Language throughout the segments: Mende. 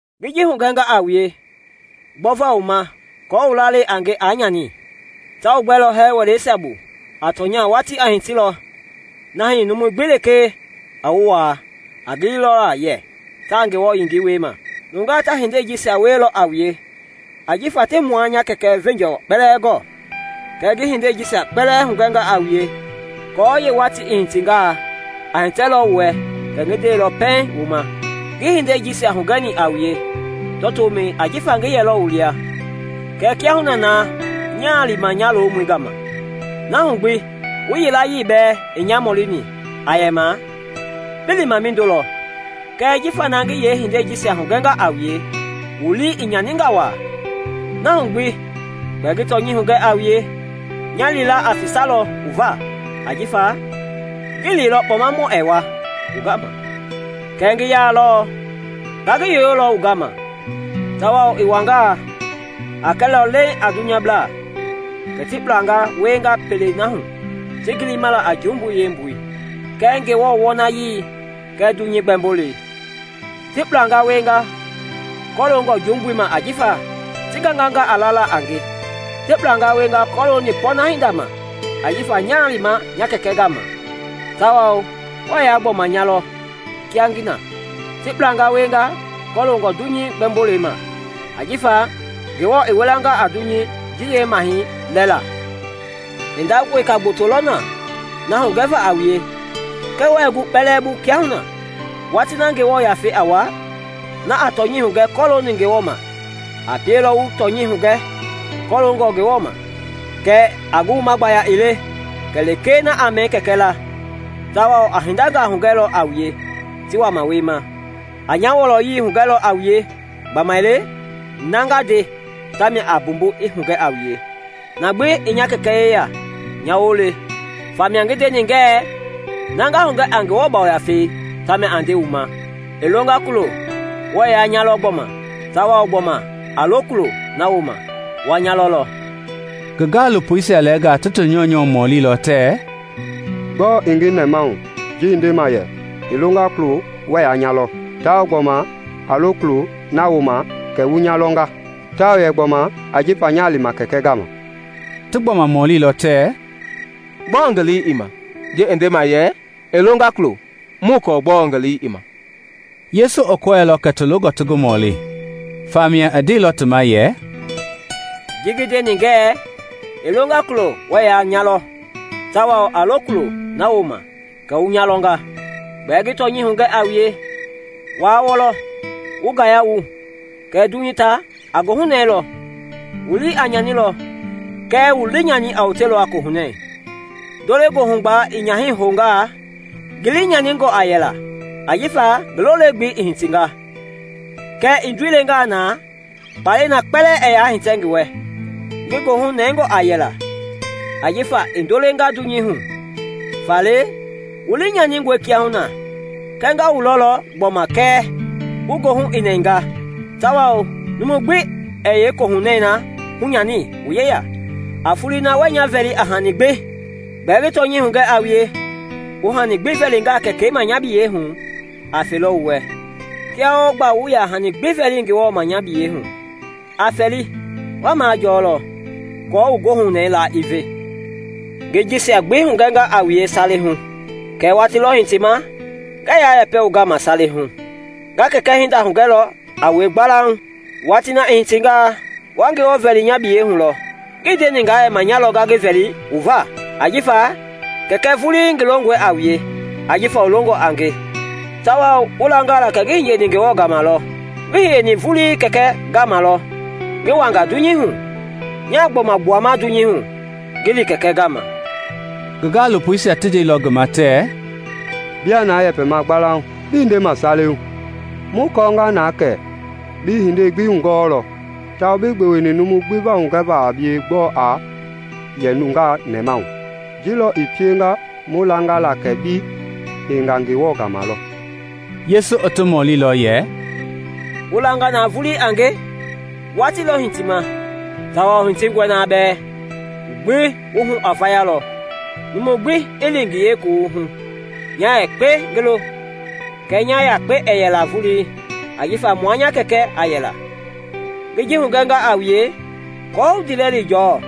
“Ngi ji hugɛnga a wue gbɔva wu ma aako wu lalei a nge aa nyani. Ta wu gbɛlɔ hɛɛ wɛleisia bu; a tɔnya watii a hitilɔ na hii numu gbi lekee a wu waa, a gili lɔ yɛ taa Ngewɔ yengei wiema. Nungaa ta hindei jisia wielɔ a wue ajifa tii mua nya Kɛkɛ veenjɔɔ kpɛlɛɛ gɔɔ. Kɛɛ ngi hindei jisia kpɛlɛɛ hugɛnga a wue aako yeewatii i hitingaa, a hitɛlɔ wu wɛ kɛ ngi ndeilɔ pɛiŋ wu ma. “Ngii hindei jisia hugɛni a wue tɔtomɛi ajifa ngi yɛlɔ wu lia. Kɛɛ kiahuna naa nyaa lima nya lomɔi gama; na hu gbi wu yilayee bɛɛ ii nya mɔlini aa yɛma ‘Bi lima mindo lɔ?’ Kɛɛ jifa na ngi yeehindei jisia hugɛnga a wue, wu lii i nyaninga waa. Na hu gbi gbɛɛ ngi tɔnyɛi hugɛ a wue: nya lila a fisalɔ wu va, ajifa ngii liilɔ Kpɔmamɔi ɛɛ wa wu gama; kɛɛ ngi yalɔ, nga ngi yoyolɔ wu gama. Tawao i wangaa, a kɛlɔ leeŋ a dunyablaa kɛ ti kpulanga wienga pelei na hu ti gilima a jumbui yeembui kɛɛ Ngewɔ wɔnayii kɛɛ dunyei gbɛmbolei. Ti kpulanga wienga kɔloongɔ jumbui ma ajifa ti ganganga a lala a nge; ti kpulanga wienga kɔlooni pɔɔna hinda ma ajifa nyaa lima nya Kɛkɛ gama tawao wɛɛ yaa gbɔma nya lɔ kia ngi na; ti kpulanga wienga kɔloongɔ dunyei gbɛmbolei ma ajifa Ngewɔ i wilanga a dunyei ji yeemahɛi lɛɛla. “Hinda weka gboto lɔ na hugɛva a wue kɛɛ wɛi gu kpɛlɛɛ bu kiahuna. Watii na Ngewɔ Yafei a wa, na a tɔnyɛi hugɛ kɔloongɔ Ngewɔ ma, a pielɔ wu tɔnyɛi hugɛ kɔloongɔ Ngewɔ ma. Kɛɛ a ngi wuma gbaya ii le kɛ lekee na a mɛni Kɛkɛi laa, tawao a hindangaa hugɛlɔ a wue ti wama wiema. A nya wɔlɔyei hugɛlɔ a wue gbamaile na nga nde, tamia a mbumbu i hugɛ a wue. Na gbi i nya Kɛkɛ yeya nya woo le; famia ngi ndeni ngɛɛ na nga hugɛ a Ngewɔ Yafei tamia a nde wu ma. “I longa kulo, wɛɛ yaa nya lɔ gbɔma, tawao gbɔma a lo kulo na wooma, wa nya lɔlɔ.” Ngi gaalopoisia lɛɛnga ti ti nyɔunyɔ mɔlilɔ tɛɛ, “Gbɔɔ i ngi nɛmahu ji i ndema yɛ, ‘I longa kulo wɛɛ yaa nya lɔ, tawao gbɔma a lo kulo na wooma kɛ wu nya lɔnga;’ tawao yɛ gbɔma, ‘Ajifa nyaa lima Kɛkɛi gama’?” Ti gbɔma mɔlilɔ tɛɛ, “Gbɔɔ ngi lii i ma ji i ndema yɛ, ‘I longa kulo’? Muii kɔɔ gbɔɔ ngi lii i ma.” Yesu i kɔɛilɔ kɛ ti longɔ ti ngi mɔli; famia i ndeilɔ ti ma yɛ, “Ji ngi ndeni ngɛɛ ‘I longa kulo wuɛ yaa nya lɔ, tawao a lo kulo na wooma kɛ wu nya lɔnga.’” Gbɛɛ ngi tɔnyɛi hugɛ a wue, wa wɔlɔ, wu ngaya wu, kɛɛ dunyei ta a goohunɛɛlɔ; wu lii a nyanilɔ kɛɛ wu liinyani a wotelɔ a kohunɛɛ. Ndo-le-goohugbalɛi i nyaha houngaa, ngi lii nyaningɔ a yɛla ajifa ngi lo le-gbelei i hitinga; kɛɛ i ndoi lengaa na, kpalɛi na kpɛlɛɛ ɛɛ yaa hitɛ ngi wɛ; ngi goohu nɛngɔ a yɛla ajifa i ndoo lenga dunyei hu. Faale, wu lii nyaningɔe kiahuna, kɛɛ nga wu lɔlɔ gbɔma kɛ wu goohu i nɛnga, tawao numu gbi ɛɛ yeekohunɛɛ na hunyani wu yeya. “A foloi na wuɛɛ nya vɛli a hani gbi. Gbɛɛ ngi tɔnyɛi hugɛ a wue, wu hani gbi vɛlingaa Kɛkɛi ma nya biyɛi hu a felɔ wu wɛ. Kia wɔɔ gba wuii yaa hani gbi vɛlini Ngewɔ ma nya biyɛi hu; a fɛli, wa majɔɔlɔ, aako wu goohunɛi laa i ve. “Ngi jisia gbi hugɛnga a wue sale hu, kɛɛ watii lɔ hitima ngɛɛ yaa yɛpɛ wu gama sale hu; nga Kɛkɛi hinda hugɛlɔ a wue gbalauŋ. Watii na i hitingaa, wa Ngewɔ vɛli nya biyɛi hu lɔ; ngii ndeni nga yɛma nya lɔ nga ngi vɛli wu va. Ajifa Kɛkɛi vulii ngi longɔe a wue ajifa wu longɔ a nge tawao wu langa la kɛ ngi hiyeni Ngewɔ gama lɔ. Ngi hiyeni vulii Kɛkɛi gama lɔ ngi wanga dunyei hu; nyaa gbɔma gbuama dunyei hu ngi li Kɛkɛi gama.” Ngi gaalopoisia ti ndeilɔ ngi ma tɛɛ, “Biaa na yɛpɛma gbalauŋ, bii ndema sale hu. Mu kɔɔnga na kɛ bi hindei gbi hugɔɔlɔ tawao bii gbeweni numu gbi va hugɛva a bie gbɔɔ a yɛ nungaa nɛmahu. Ji lɔ i pienga mu langa la kɛ bi hiyenga Ngewɔ gama lɔ.” Yesu i ti mɔlilɔ yɛ, “Wu langa na vulii a nge? Watii lɔ hitima, tawao hitingɔe na bɛɛ, wu gbi wu hu a vayalɔ, numu gbi i li ngi yeekuwuhu, nya yakpe ngi lo. Kɛɛ nya yakpe ɛɛ yɛla vulii, ajifa mua nya Kɛkɛ a yɛla. Ngi ji hugɛnga a wue aako wu ndiilɛli jɔɔ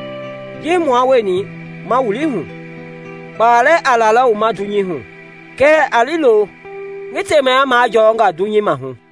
ji mua wueni ma wili hu. Kpalɛ a lalɔ wu ma dunyei hu; kɛɛ a liilo ngi temaya majɔɔnga dunyei maahu.”